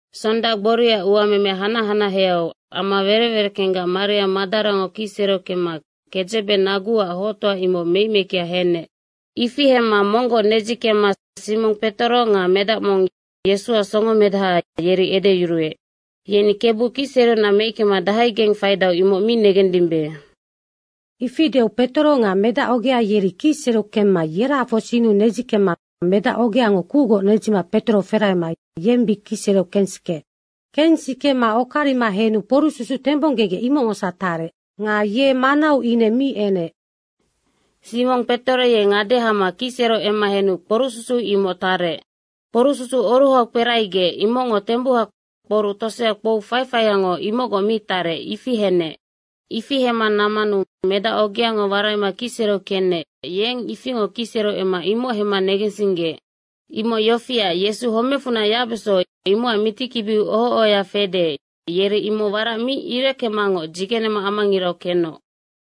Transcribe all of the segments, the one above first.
Sonda gboria uameme hanac hanaheau ama werec wereckenggac Maria Madarango kicsereu kemma kedzebe naguac hoctoa, imoc meic meickea henec. Ifi hemma monggoc nedzikemma Simong Petoro nga medac mong, Yesuac songomedaha, yeri edeyuruec, “Yeni Kebu kicsereunac meickema dahaigeng faidau, imoc mi negendimbe.” Ifi deu Petoro nga medac ogea yeri kicsereu kemma yerahafoc sinnu nedzikemma medacogeango kucgoc nedzima Petoro ferahema yeng bic kicsereu kensikeec. Kensikema okarima henu kporucsusu tembonggegec, imocngosac tarec. Nga ye manau ine mi enec. Simong Petoro ye ngade hama kicsereu emma henu kporucsusu imoc tarec. Kporucsusu oruhau kperahagec, imocngo tembuha kporuc tosea kpou faifaiango imocgoc mi tarec, ifi henec. Ifi hemma nammanu medacogea waraima kicsereu kenec, yeng ifingoc kicsereu emma imoc hemma negensinggeec. Imoc yofiac, Yesu homecfunac yacbeso, imocac mitikibiu oho ohoya fede, yeri imoc warac mi ireckemangoc dzigenema amangirau kenoc.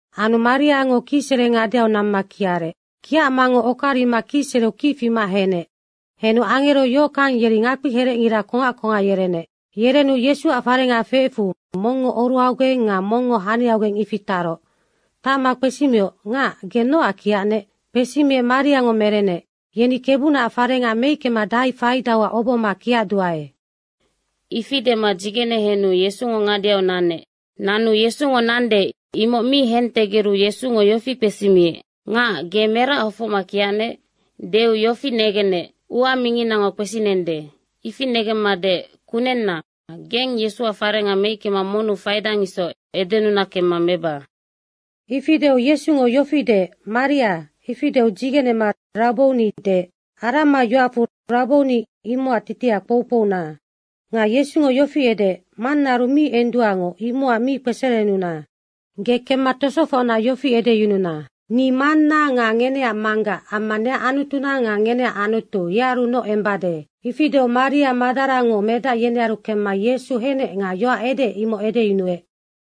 Anu Mariango kicsere ngadeau namma kiarec. Kiacmangoc okarima kicsereu kic fima henec. Henu angero yohockang yeri ngakpiherecngira kongac kongac yerenec. Yerenu Yesuac farenga feecfu, mongngo oruhaugeng nga mongngo haniaugeng, ifi taroc. Tacma kpesimioc, “Ngac, ge nocac kiacnec?” kpesimiec Mariango merenec, “Yeni Kebunaac farenga meickema dahai faidauac obohoma kiacduae.” Ifi dema dzigene henu Yesungo ngadeau nanec. Nanu Yesungo nande, imoc mi hentegeru Yesungo yofi kpesimiec, “Ngac, ge merac hofocma kiacnec?” deu negenec, “Ua minginango kpesinende.” ifi negemma deec, “Kunenna, geng Yesuac farenga meickema monnu faidang isoc edenuna kemma meba.” Ifi deu Yesungo yofi deec, “Maria.” ifi deu dzigenema “Rabbouni.” deec. (Arama yoacfu Rabbouni, imocac titiha kpoukpouna.) Nga Yesungo yofi edeec, “Mannaaru mi enduangoc, imocac mi kpeserenuna. Ge kemma tosofocna yofi edeyununa, ‘Ni Manna nga ngeneac Manggac amma neac Anutuna nga ngeneac Anutu, yearunoc embade.’” Ifi deu Maria Madarango medac yenearu kemma Yesu henec nga yoac edeec, imoc edeyunuec.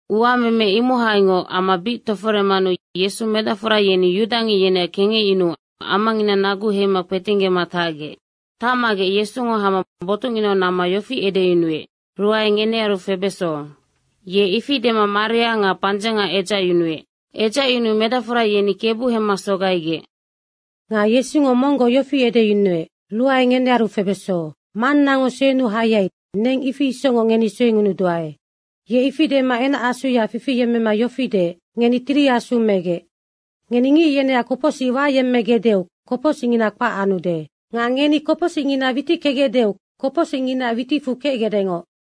Uameme imohaingoc ama bic toforemanu Yesu medacfora yeni yudangic yeneac kengecyunuu amangina nagu heima kpetinggema tacgec. Tacmagec Yesungo hama botucnginau namma yofi edeyunuec, “Ruae ngenearu febeso.” Ye ifi dema maria nga pandzenga edzacyunuec. Edzacyunuu medacfora yeni Kebu hemma sogaigec. Nga Yesungo monggoc yofi edeyunuec, “Ruae ngenearu febeso. Mannango suenuu hayai, neng ifi isocngoc ngeni suengunuduae.” Ye ifi dema enacasuya fifiyemmema yofi deec, “Ngeni Tiri Asu megec.” Ngeni ngic yeneac kopocsic wayemmegecdeu kopocsicngina kpac anude. Nga ngeni kopocsicngina witickegecdeu kopocsicnginaac witicfu kecgecdengoc.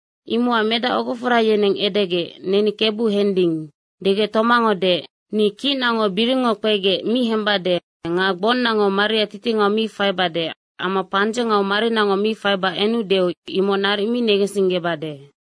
Imocac medac ogofora yeneng edegec, “Neni Kebu hending.” degec Tomango deec, “Ni kicnango biringngo kpegec mi hembade nga gbonnango maria titingau mi faibade amma pandzengau marinango mi faiba enudeu imoc naric mi negensinggebade.”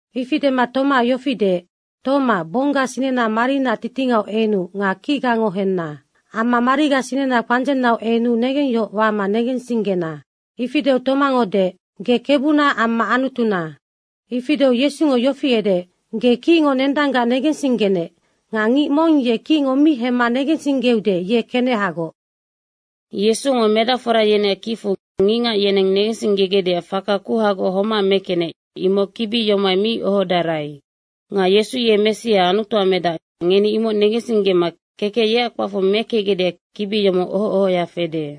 Ifi dema Tomaac yofi deec, “Toma, gbongga sinena marinaac titingau enu nga kicgango henna. Amma mariga sinena pandzennau enu negengyohoc wama negensinggena.” Ifi deu Tomango deec, “Ge Kebuna amma Anutuna.” ifi deu Yesungo yofi edeec, “Ge kicngo nendanggac negensinggenec. Nga ngic mong ye kicngo mi hemma negensinggeude, ye kenehagoc.” Yesungo medacfora yeneac kicfu ngicngac yeneng negensinggegecdeac faka kuhagoc homac mekenec, imoc kibi yomohai mi ohodarai. Nga Yesu ye Messia Anutuac medac, ngeni imoc negensinggema kekec yeac kpacfu mekecgecdeac kibi yomoc oho ohoya fede.